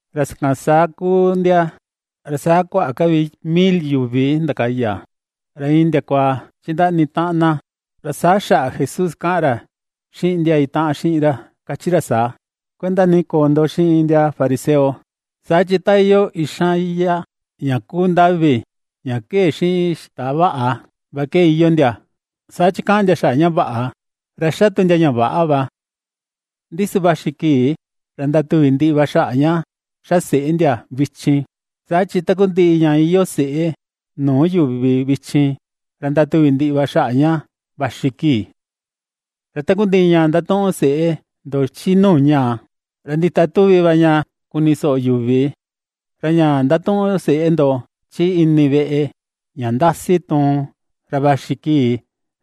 Ra sakan saa kuu ndia, ra saa kuaꞌa ka vi mil yuvi ndakaya, ra iin ndiakua chindaꞌni taꞌan na. Ra saa xaꞌa Jesús kaꞌan ra xiꞌin ndia itaꞌan xiꞌin ra kachi ra saa: ―Kuenda ni koo ndo xiꞌin ndia fariseo. Saa chi ta iyoo ixan iyá ña kuu ndavi ña kee̱ xiꞌin xita vaꞌa, va ke iyoo ndia. Saa chi kaꞌan ndia xaꞌa ña vaꞌa, ra xa tu ndia ña väꞌa va. Ndi su vaxi kii ra ndatuvi ndiꞌi va xaꞌa ña ^xa seꞌe ndia vichin. Saa chi takundiꞌi ña iyoo seꞌe nuu yuvi vichin, ra ndatuvì ndiꞌi va xaꞌa ña vaxi kii. Ra takundiꞌi ña ndatuꞌun seꞌe ndo chi nuu ñaa, ra ndita tuvi va ña kuni soꞌo yuvi; ra ña ndatuꞌun seꞌe ndo chi ini veꞌe, ña ndasi tuun, ra vaxi kii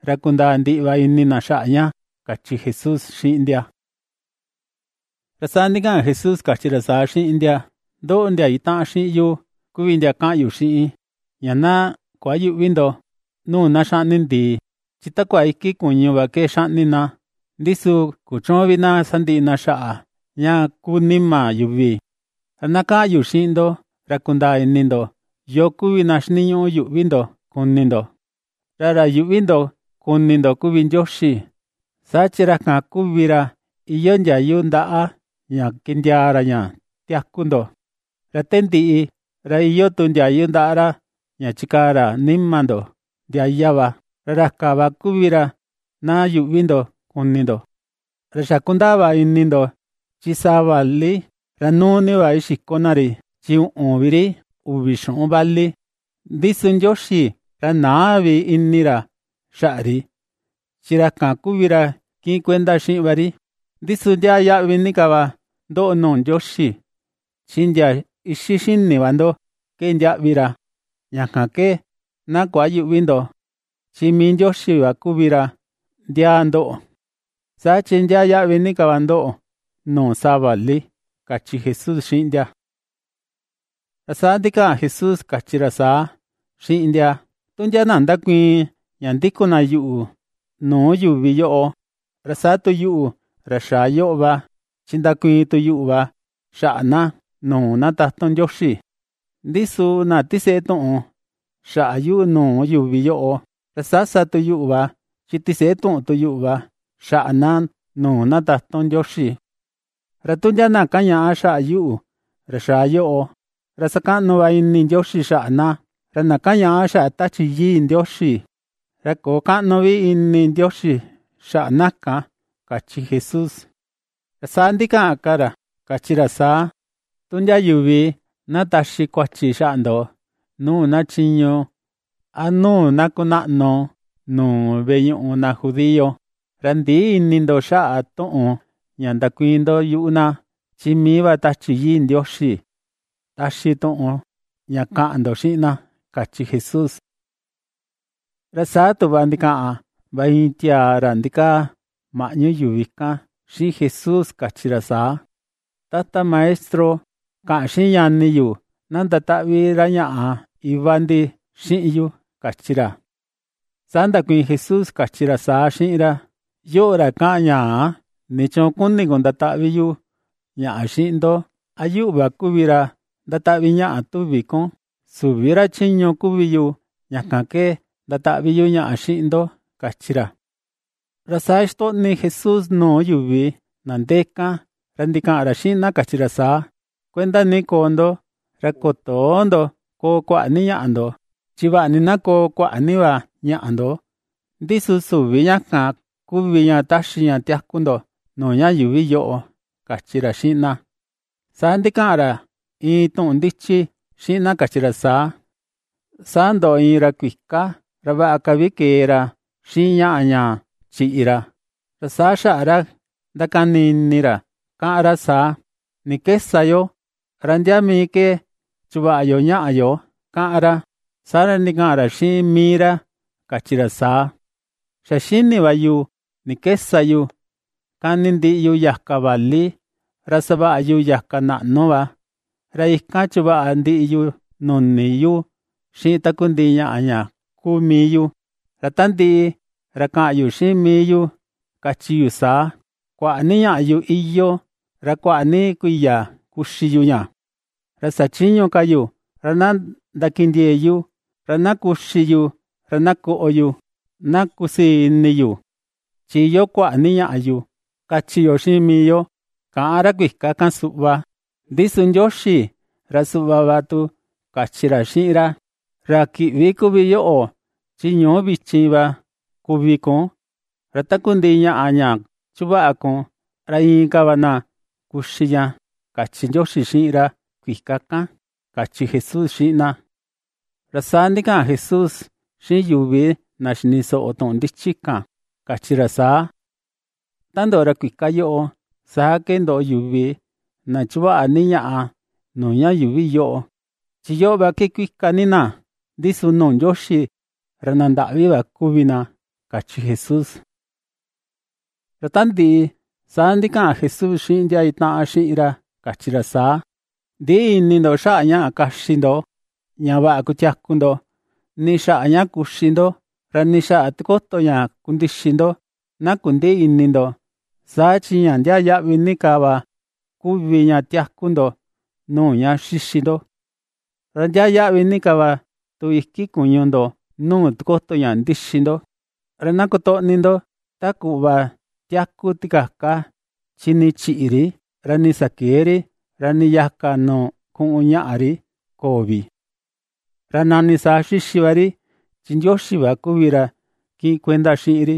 ra kundaa ndiꞌi va ini na xaꞌa ña ―kachi Jesús xiꞌin ndia. Ra saa ndikaꞌan Jesús kachi ra saa xiꞌin ndia: ―Ndoꞌo, ndia itaꞌan xiꞌin yu, kuvi ndia kaꞌan yu xiꞌin, ña na kuayüꞌvi ndo nuu na xaꞌni ndii. Chi takua iki kuñu va ke xaꞌni na, ndi su kuchüun vi na sandiꞌi na xaꞌa ña ku nima yuvi. Ra na kaꞌan yu xiꞌin ndo ra kundaa ini ndo yoo kuvi na xiniñuꞌu yuꞌvi ndo kuni ndo: ra ra yuꞌvi ndo kuni ndo kuvi Ndioxi, saa chi ra kan kuvi ra iyoo ndiayu ndaꞌa ña kindiaa ra ña tiaku ndo, ra te ndiꞌi, ra iyoo tu ndiayu ndaꞌa ra ña chikaa ra nima ndo ndiaya va. Ra ra kan va kuvi ra na yuꞌvi ndo kuni ndo. ’Ra xa kundaa va ini ndo, chi saa vali, ra nuu ni va ixiko na ri; chi uꞌun vi ri uvi xuꞌun vali. Ndi su Ndioxi ra näa vi ini ra xaꞌa ri. Chi ra kan kuvi ra kiꞌin kuenda xiꞌin va ri. Ndi su ndiaa yaꞌvi ni ka va ndoꞌo nuu Ndioxi. Chi ndia ixi xini va ndo ke ndiaꞌvi ra. Ña kan ke na kuayüꞌvi ndo. Chi mii Ndioxi va kuvi ra ndiaa ndoꞌo. Saa chi ndiaa yaꞌvi ni ka va ndoꞌo nuu saa vali ―kachi Jesús xiꞌin ndia. Ra saa ndikaꞌan Jesús kachi ra saa xiꞌin ndia: ―Tu ndia na ndakuiin ña ndikun na yuꞌu nuu yuvi yoꞌo, ra saa tu yuꞌu, ra xaa yoꞌo va, chi ndakuiin tu yuꞌu va xaꞌa na, nuu na tatun Ndioxi. Ndi su, na tiseꞌe tuꞌun xaꞌa yu nuu yuvi yoꞌo, ra saa sa tu yuꞌu va, chi tiseꞌe tuꞌun tu yuꞌu va xaꞌa na, nuu na tatun Ndioxi. ’Ra tu ndia na kañaꞌa xaꞌa yuꞌu, ra xaa yoꞌo, ra sakaꞌnu va ini Ndioxi xaꞌa na. Ra na kañaꞌa xaꞌa Tachi Yii Ndioxi, ra köo kaꞌnu vi ini Ndioxi xaꞌa na kan ―kachi Jesús. Saa ndikaꞌan ka ra kachi ra saa: ―Tu ndia yuvi na taxi kuachi xaꞌa ndo nuu na chiñu a nuu na kunaꞌnu nuu veꞌe ñuꞌu na judío, ra ndïꞌi ini ndo xaꞌa tuꞌun ña ndakuiin ndo yuꞌu na. Chi mii va Tachi Yii Ndioxi taxi tuꞌun ña kaꞌan ndo xiꞌin na ―kachi Jesús. Ra saa tuꞌva ndikaꞌan va iin tiaa ra ndikaa maꞌñu yuvi kan xiꞌin Jesús kachi ra saa: ―Tata Maestro, kaꞌan xiꞌin ñani yu ña na ndataꞌvi ra ñaꞌa iva ndi xiꞌin yu ―kachi ra. Saa ndakuiin Jesús kachi ra saa xiꞌin ra: ―Yoꞌo, ra kaꞌan ñaa, ¿nichuun kuni kun ndataꞌvi yu ñaꞌa xiꞌin ndo? ¿A yuꞌu va kuvi ra ndataꞌvi ñaꞌa, tuvi kun? Süvi ra chiñu kuvi yu ña kan ke ndataꞌvi yu ñaꞌa xiꞌin ndo ―kachi ra. Ra saa xitoꞌni Jesús nuu yuvi na ndee kan, ra ndikaꞌan ra xiꞌin na kachi ra saa: ―Kuenda ni koo ndo, ra kotöo ndo koo kuaꞌa ni ñaꞌa ndo. Chi vaꞌa ni na koo kuaꞌa ni va ñaꞌa ndo, ndi su süvi ña kan kuvi ña taxi ña tiaku ndo nuu ña yuuvi yoꞌo ―kachi ra xiꞌin na. Saa ndikaꞌan ra iin tuꞌun ndichi xiꞌin na kachi ra saa: ―Saa ndoꞌo iin ra kuika, ra vaꞌa ka vi ke̱e ra xiꞌin ñaꞌa ña chiꞌi ra. Ra saa xaꞌa ra ndakani ini ra, kaꞌan ra saa: “¿Ni ke sa yo? ¿Ra ndia mii ke chuvaꞌa yo ñaꞌa yo?”, kaꞌan ra. Saa ndikaꞌan ra xiꞌin mii ra kachi ra saa: “Xa xini va yu ni ke sa yu: kani ndiꞌi yu yaka vali, ra savaꞌa yu yaka naꞌnu vaꞌa. Ra ikan chuvaꞌa ndiꞌi yu nuni yu xiꞌin takundiꞌi ñaꞌa ña kuu mii yu. Ra ta ndiꞌi, ra kaꞌan yu xiꞌin mii yu kachi yu saa: Kuaꞌa ni ñaꞌa yu iyoo, ra kuaꞌa ni kuiya kuxi yu ña. Ra sachïñu ka yu, ra na ndakindiee̱ yu, ra na kuxi yu, ra na koꞌo yu, na kusii ini yu, chi iyoo kuaꞌa ni ñaꞌa yu, kachi yo xiꞌin mii yo”, kaꞌan ra kuika kan suꞌva. Ndi su Ndioxi ra suꞌva va tu kachi ra xiꞌin ra: “Ra kiꞌvi kuvi yoꞌo, chi ñuu vichin va kuvi kun. Ra takundiꞌi ñaꞌa, ña chuvaꞌa kun, ra inka va na kuxi ña”, kachi Ndioxi xiꞌin ra kuika kan ―kachi Jesús xiꞌin na. Ra saa ndikaꞌan Jesús xiꞌin yuvi, na xini soꞌo tuꞌun ndichi kan kachi ra saa: ―Ta ndoꞌo ra kuika yoꞌo, saa ke ndoꞌo yuvi, na chuvaꞌa ni ñaꞌa nuu ña yuuvi yoꞌo. Chi yoꞌo va ke kuika ni na, ndi su nuu Ndioxi ra na ndaꞌvi va kuvi na ―kachi Jesús. Ra ta ndiꞌi, saa ndikaꞌan Jesús xiꞌin ndia itaꞌan xiꞌin ra kachi ra saa: ―Ndïꞌi ini ndo xaꞌa ñaꞌa kaxi ndo ña vaꞌa kutiaku ndo, nii xaꞌa ña kuxi ndo, ra nii xaꞌa tikoto ña kundixi ndo na kundïꞌi ini ndo. Saa chi ña ndiaa yaꞌvi ni ka va kuvi ña tiaku ndo nuu ña xixi ndo; ra ndiaa yaꞌvi ni ka va tu iki kuñu ndo nuu tikoto ña ndixi ndo. Ra na kotoꞌni ndo ta kuꞌva tiaku tikaka, chi nii chïꞌi ri, ra nii sakëe ri, ra nii yaka nuu kuꞌun ñaꞌa ri köo vi. Ra nani saa xixi va ri chi Ndioxi va kuvi ra kiꞌin kuenda xiꞌin ri.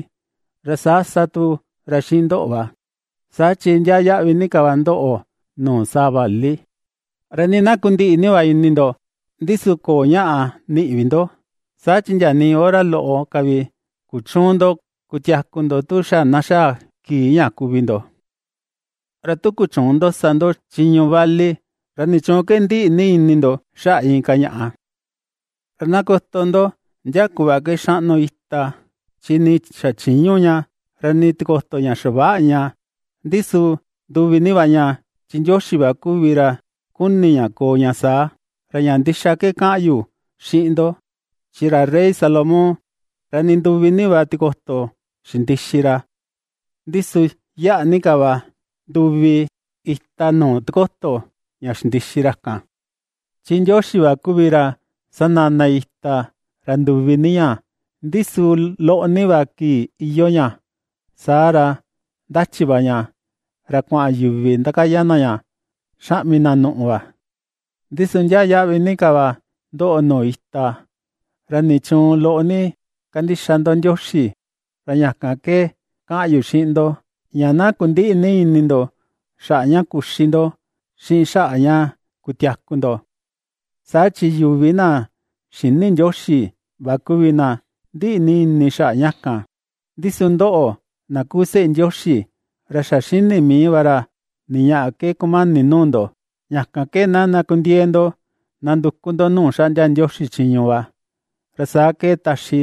Ra saa sa tu ra xiꞌin ndoꞌo va, saa chi ndiaa yaꞌvi ni ka va ndoꞌo nuu saa vali. Ra nii na kundiꞌi ni va ini ndo, ndi su köo ñaꞌa niꞌi vi ndo, saa chi ndia nii hora loꞌo ka vi kuchüun ndo kutiaku ndo tu xa na xaa kii ña kuvi ndo. Ra tu kuchüun ndo sa ndo chiñu vali, ¿ra nichuun ke ndiꞌi ni ini ndo xaꞌa inka ñaꞌa? ’Ra na koto ndo ndia kuꞌva ke xaꞌnu ita, chi nii xachïñu ña, ra nii tikoto ña xaväꞌa ña. Ndi su nduvi ni va ña, chi Ndioxi va kuvi ra kuni ña koo ña saa. Ra ña ndixa ke kaꞌan yu xiꞌin ndo, chi ra rey Salomón, ra nduvi ni va tikoto xindixi ra. Ndi su yaꞌa ni ka va nduvi ita nuu tikoto ña xindixi ra kan. Chi Ndioxi va kuvi ra sanana ita, ra nduvi ni ña; ndi su loꞌo ni va kii iyoo ña, saa ra ndachi va ña, ra kuaꞌan yuvi ndakaya na ña xaꞌmi na nuꞌu va. Ndi su ndiaa yaꞌvi ni ka va ndoꞌo nuu ita. ¿Ra nichuun loꞌo ni kandixa ndo Ndioxi? Ra ña kan ke kaꞌan yu xiꞌin ndo, ña na kundïꞌi ni ini ndo xaꞌa ña kuxi ndo, xiꞌin xaꞌa ña kutiaku ndo. Saa chi yuvi na xïni Ndioxi va kuvi na ndiꞌi ni ini xaꞌa ña kan. Ndi su ndoꞌo, na kuu seꞌe Ndioxi, ra xa xini mii va ra ni ñaꞌa ke kumani nuu ndo. Ña kan ke na ndakundiee ndo nanduku ndo nuu xaꞌndia Ndioxi chiñu va, ra saa ke taxi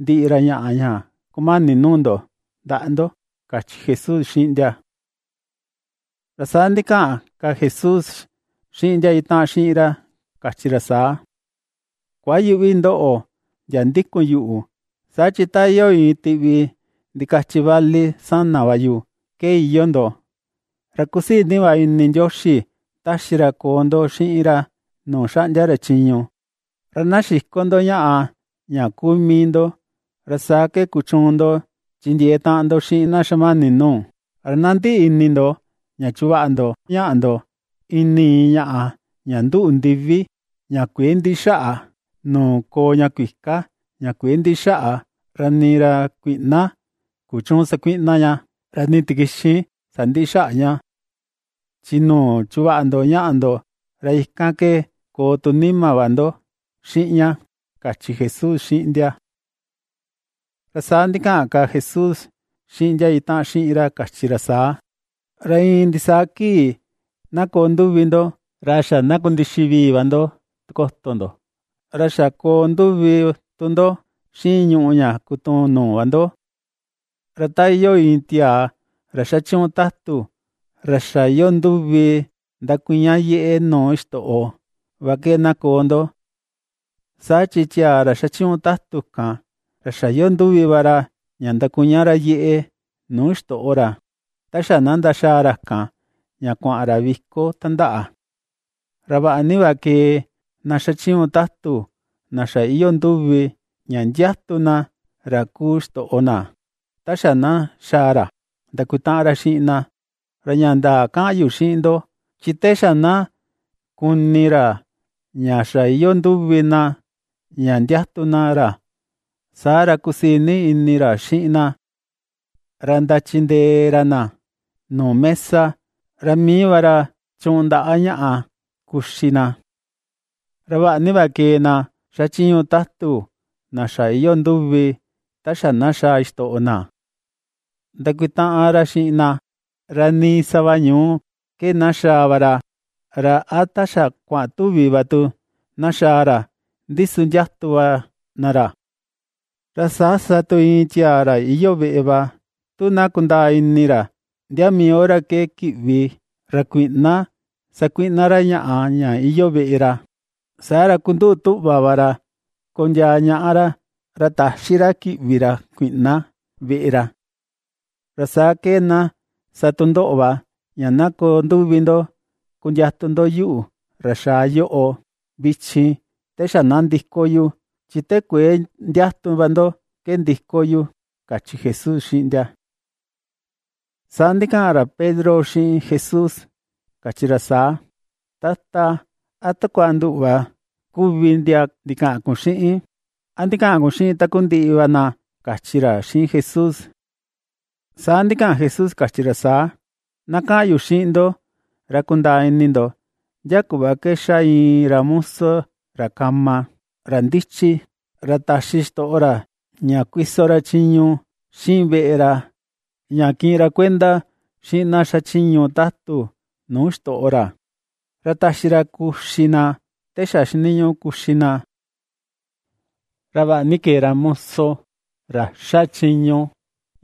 ndiꞌi ra ñaꞌa ña kumani nuu ndo ndaꞌa ndo ―kachi Jesús xiꞌin ndia. Ra saa ndikaꞌan ka Jesús xiꞌin ndia itaꞌan xiꞌin ra kachi ra saa: ―Kuayüꞌvi ndoꞌo, ndia ndikun yuꞌu, saa chi ta iyoo iin tiꞌvi ndikachi vali sana va yu, ke iyoo ndo. Ra kusii ni va ini Ndioxi taxi ra koo ndo xiꞌin ra nuu xaꞌndia ra chiñu. Ra na xiko ndo ñaꞌa ña kuu mii ndo, ra saa ke kuchuun ndo chindiee taꞌan ndo xiꞌin na xamani nuu. Ra na ndiꞌi ini ndo ña chuvaꞌa ndo ñaꞌa ndo ini ñaꞌa ña nduꞌu ndivi, ña kuëe ndiꞌi xaꞌa, nuu koo ña kuika ña kuëe ndiꞌi xaꞌa, ra nii ra kuiꞌna kuchüun sakuiꞌna ña, ra nii tikixin sandïꞌi xaꞌa ña. Chi nuu chuvaꞌa ndo ñaꞌa ndo, ra ikan ke koo tu nima va ndo xiꞌin ña ―kachi Jesús xiꞌin ndia. Ra saa ndikaꞌan ka Jesús xiꞌin ndia itaꞌan xiꞌin ra kachi ra saa: ―Ra iin ndisaa kii na koo nduvi ndo, ra xa na kundixi vii va ndo tikoto ndo, ra xa koo nduvi tu ndo xiꞌin ñuꞌu ña kutuun nuu va ndo. Ra ta iyoo iin tiaa ra xachiñu tatu, ra xa iyoo nduvi ndakuña yeꞌe nuu xitoꞌo, va ke na koo ndo. Saa chi tiaa ra xachiñu tatu kan, ra xa iyoo nduvi va ra ña ndakuña ra yeꞌe nuu ixtoꞌo ra, ta xa na ndaxaa ra kan ña kuaꞌan ra viko tandaꞌa. Ra vaꞌa ni va kee na xachiñu tatu na xa iyoo nduvi, ña ndiatu na ra kuu xitoꞌo na ta xa na xaa ra ndakutaꞌan ra xiꞌin na; ra ña ndaa kaꞌan yu xiꞌin ndo, chi te xa na kuni ra ña xa iyoo nduvi na ña ndiatun na ra, saa ra kusii ni ini ra xiꞌin na. Ra ndachindee ra na nuu mesa, ra mii va ra chuꞌun ndaꞌa ña kuxi na. Ra vaꞌa ni va kee na xachiñu tatu na xa iyoo nduvi ta xa na xaa xitoꞌo na ndakutaꞌan ra xiꞌin na, ra nii sava ñuu ke na xaa va ra, ra a ta xa kuaꞌan tuvi va tu na xaa ra, ndi su ndiatu va na ra. Ra saa sa tu iin tiaa ra iyoo veꞌe va, tu na kundaa ini ra ndia mii hora ke kiꞌvi ra kuiꞌna sakuiꞌna ra ñaꞌa ña iyoo veꞌe ra, saa ra kunduꞌu tuꞌva va ra kondiaa ñaꞌa ra; ra täxi ra kiꞌvi ra kuiꞌna veꞌe ra. Ra saa ke na sa tu ndoꞌo va, ña na koo nduvi ndo kundiatun ndo yuꞌu, ra xaa yoꞌo vichin te xa na ndiko yu, chi te kuëe ndiatu va ndo ke ndiko yu ―kachi Jesús xiꞌin ndia. Saa ndikaꞌan ra Pedro xiꞌin Jesús, kachi ra saa: ―Tata, ¿a takua nduꞌu va kuvi ndia ndikaꞌan kun xiꞌin? ¿A ndikaꞌan kun xiꞌin takundiꞌi va na? ―kachi ra xiꞌin Jesús. Saa ndikaꞌan Jesús kachi ra saa: ―Na kaꞌan yu xiꞌin ndo ra kundaa ini ndo ndia kuꞌva ke xa iin ra muso ra kama, ra ndichi, ra taxi xitoꞌo ra ña kuiso ra chiñu xiꞌin veꞌe ra ña kiꞌin ra kuenda xiꞌin na xachiñu tatu nuu xitoꞌo ra, ra taxi ra kuxi na te xa xiniñuꞌu kuxi na. Ra vaꞌa ni kee ra muso ra ^xa chiñu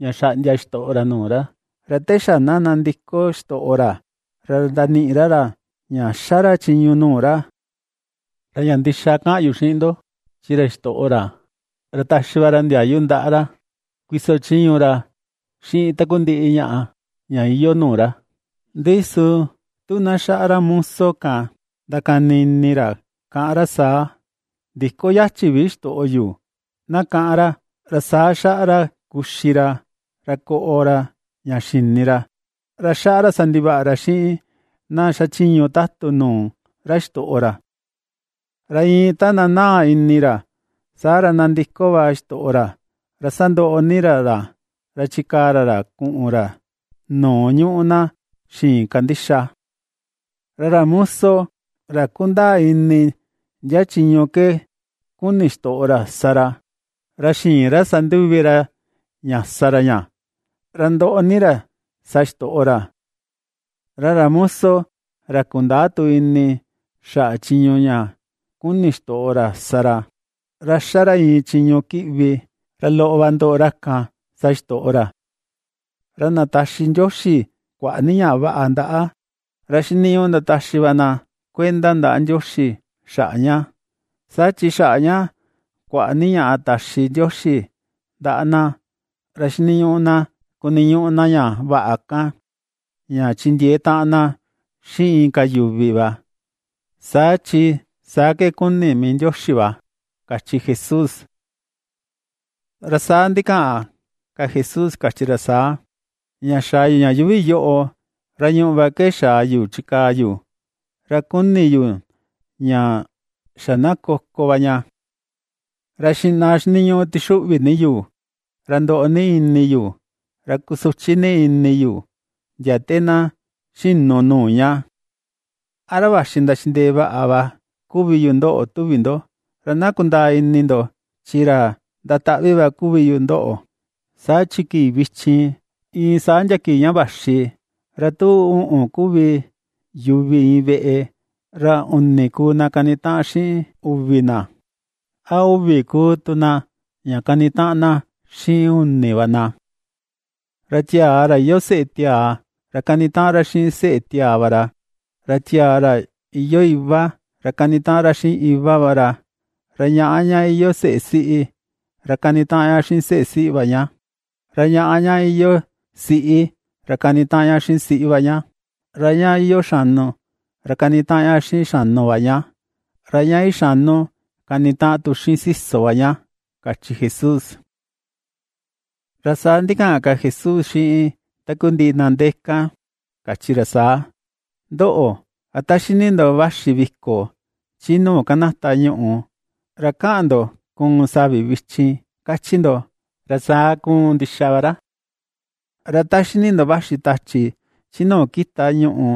ña xaꞌndia xitoꞌo ra nuu ra, ra te xa na nandiko xitoꞌo ra ra ndaniꞌi ra ra ña ^xa ra chiñu nuu ra. Ra ña ndixa kaꞌan yu xiꞌin ndo, chi ra xitoꞌo ra, ra taxi va ra ndiayu ndaꞌa ra kuiso chiñu ra xiꞌin takundiꞌi ñaꞌa ña iyoo nuu ra. Ndi su tu na xaꞌa ra moso kan ndakani ini ra, kaꞌan ra saa: “Ndïko yachi vi xitoꞌo yo”, na kaꞌan ra. Ra saa xaꞌa ra kuxi ra, ra koꞌo ra ña xini ra, ra xaꞌa ra sa ndivaꞌa ra xiꞌin na xachiñu tatu nuu ra xitoꞌo ra. Ra iin ta nanaa ini ra, saa ra ndandiko va xitoꞌo ra, ra sandoꞌo ni ra ra. Ra chikaa ra ra kuꞌun ra nuu ^ñuꞌu na xïin kandixa. ’Ra ra muso, ra kundaa ini ndia chiñu ke kuni xitoꞌo ra sa ra, ra xïin ra sa nduvi ra ña sa ra ña, ra ndoꞌo ni ra sa xitoꞌo ra. Ra ra muso ra kundäa tu ini xaꞌa chiñu ña kuni xitoꞌo ra sa ra, ra ^xa ra iin chiñu kiꞌvi, ra loꞌo va ndoꞌo ra kan sa xitoꞌo ra. Ra na taxi Ndioxi kuaꞌa ni ña vaꞌa ndaꞌa, ra xiniñuꞌu ndataxi va na kuenda ndaꞌa Ndioxi xaꞌa ña, saa chi xaꞌa ña kuaꞌa ni ña taxi Ndioxi ndaꞌa na, ra xiniñuꞌu na kuniñuꞌu na ña vaꞌa kan ña chindiee taꞌan na xiꞌin inka yuvi va, saa chi saa ke kuni mii Ndioxi va ―kachi Jesús. Ra saa ndikaꞌan ka Jesús kachi ra saa: ―Ña xaa yu ña yuuvi yoꞌo, ra ñùꞌù va ke xaa yu chikaa yu. Ra kuni ni yu ña xa na koko va ña. Ra xiꞌna xiniñuꞌu tixuꞌvi ni yu, ra ndoꞌo ni ini yu, ra kusuchi ni ini yu ndia te na xinu nuu ña. ¿A ra vaxi ndachindee vaꞌa va kuvi yu ndoꞌo tuvi ndo? Ra na kundaa ini ndo chi ra ndataꞌvi va kuvi yu ndoꞌo. Saa chi kii vichin, iin saa ndia kii ña vaxi, ra tu uꞌun kuvi yuvi iin veꞌe, ra uni kuu na kanitaꞌan xiꞌin uvi na, a uvi kuu tu na ña kanitaꞌan na xiꞌin uni va na. Ra tiaa, ra iyoo seꞌe tiaa, ra kanitaꞌan ra xiꞌin seꞌe tiaa va ra, ra tiaa, ra iyoo iva, ra kanitaꞌan ra xiꞌin iva va ra, ra ñaꞌa, ña iyoo seꞌe siꞌi, ra kanitaꞌan ña xiꞌin seꞌe siꞌi va ña; ra ñaꞌa, ña iyoo siꞌi, ra kanitaꞌan ña xiꞌin siꞌi va ña; ra ña iyoo xanu, ra kanitaꞌan ña xiꞌin xanu va ña, ra ña ixanu, kanitaꞌan tu xiꞌin siso va ña ―kachi Jesús. Ra saa ndikaꞌan ka Jesús xiꞌin takundiꞌi na ndee kan, kachi ra saa: ―Ndoꞌo, ra ta xini ndo vaxi viko chi nuu kanata ñuꞌu, ra kaꞌan ndo kuun savi vichin, kachi ndo. Ra saa kuun ndixa va ra. Ra ta xini tu ndo vaxi tachi chi nuu kita ñuꞌu,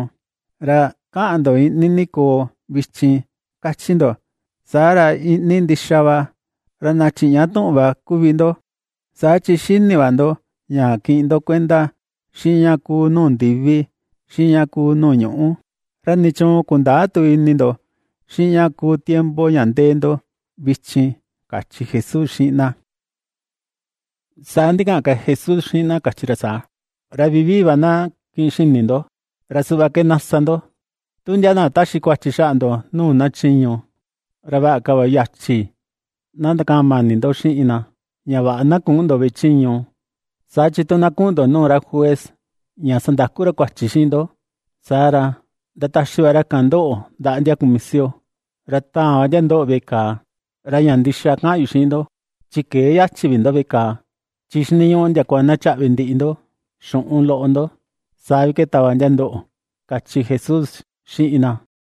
ra kaꞌan ndo iꞌni ni koo vichin, kachi ndo. Saa ra iꞌni ni ndixa va. ¡Ra na chiꞌña tuꞌun va kuvi ndo!, saa chi xini va ndo ña kiꞌin ndo kuenda xiꞌin ña kuu nuu ndivi xiꞌin ña kuu nuu ñuꞌu, ¿ra nichuun kundäa tu ini ndo xiꞌin ña kuu tiempo ña ndee ndo vichin? ―kachi Jesús xiꞌin na. Saa ndikaꞌan ka Jesús xiꞌin na kachi ra saa: ―Ra vivii va na kiꞌin xini ndo, ra suꞌva ke na sa ndo. Tu ndia na taxi kuachi xaꞌa ndo nuu na chiñu, ra vaꞌa ka va yachi na ndakaꞌan mani ndo xiꞌin na, ña vaꞌa na küꞌun ndo veꞌe chiñu; saa chi tu na kuꞌun ndo nuu ra juez ña sandaku ra kuachi xiꞌin ndo, saa ra, ndataxi va ra kan ndoꞌo ndaꞌa ndia kumisio ra taan va ndia ndoꞌo veꞌe kàà. Ra ña ndixa ke kaꞌan yu xiꞌin ndo, chi këe yachi vi ndo veꞌe kàà, chi xiniñuꞌu ndiakua na chaꞌvi ndiꞌi ndo xuꞌun loꞌo ndo, saa vi ke tava ndia ndoꞌo ―kachi Jesús xiꞌin na.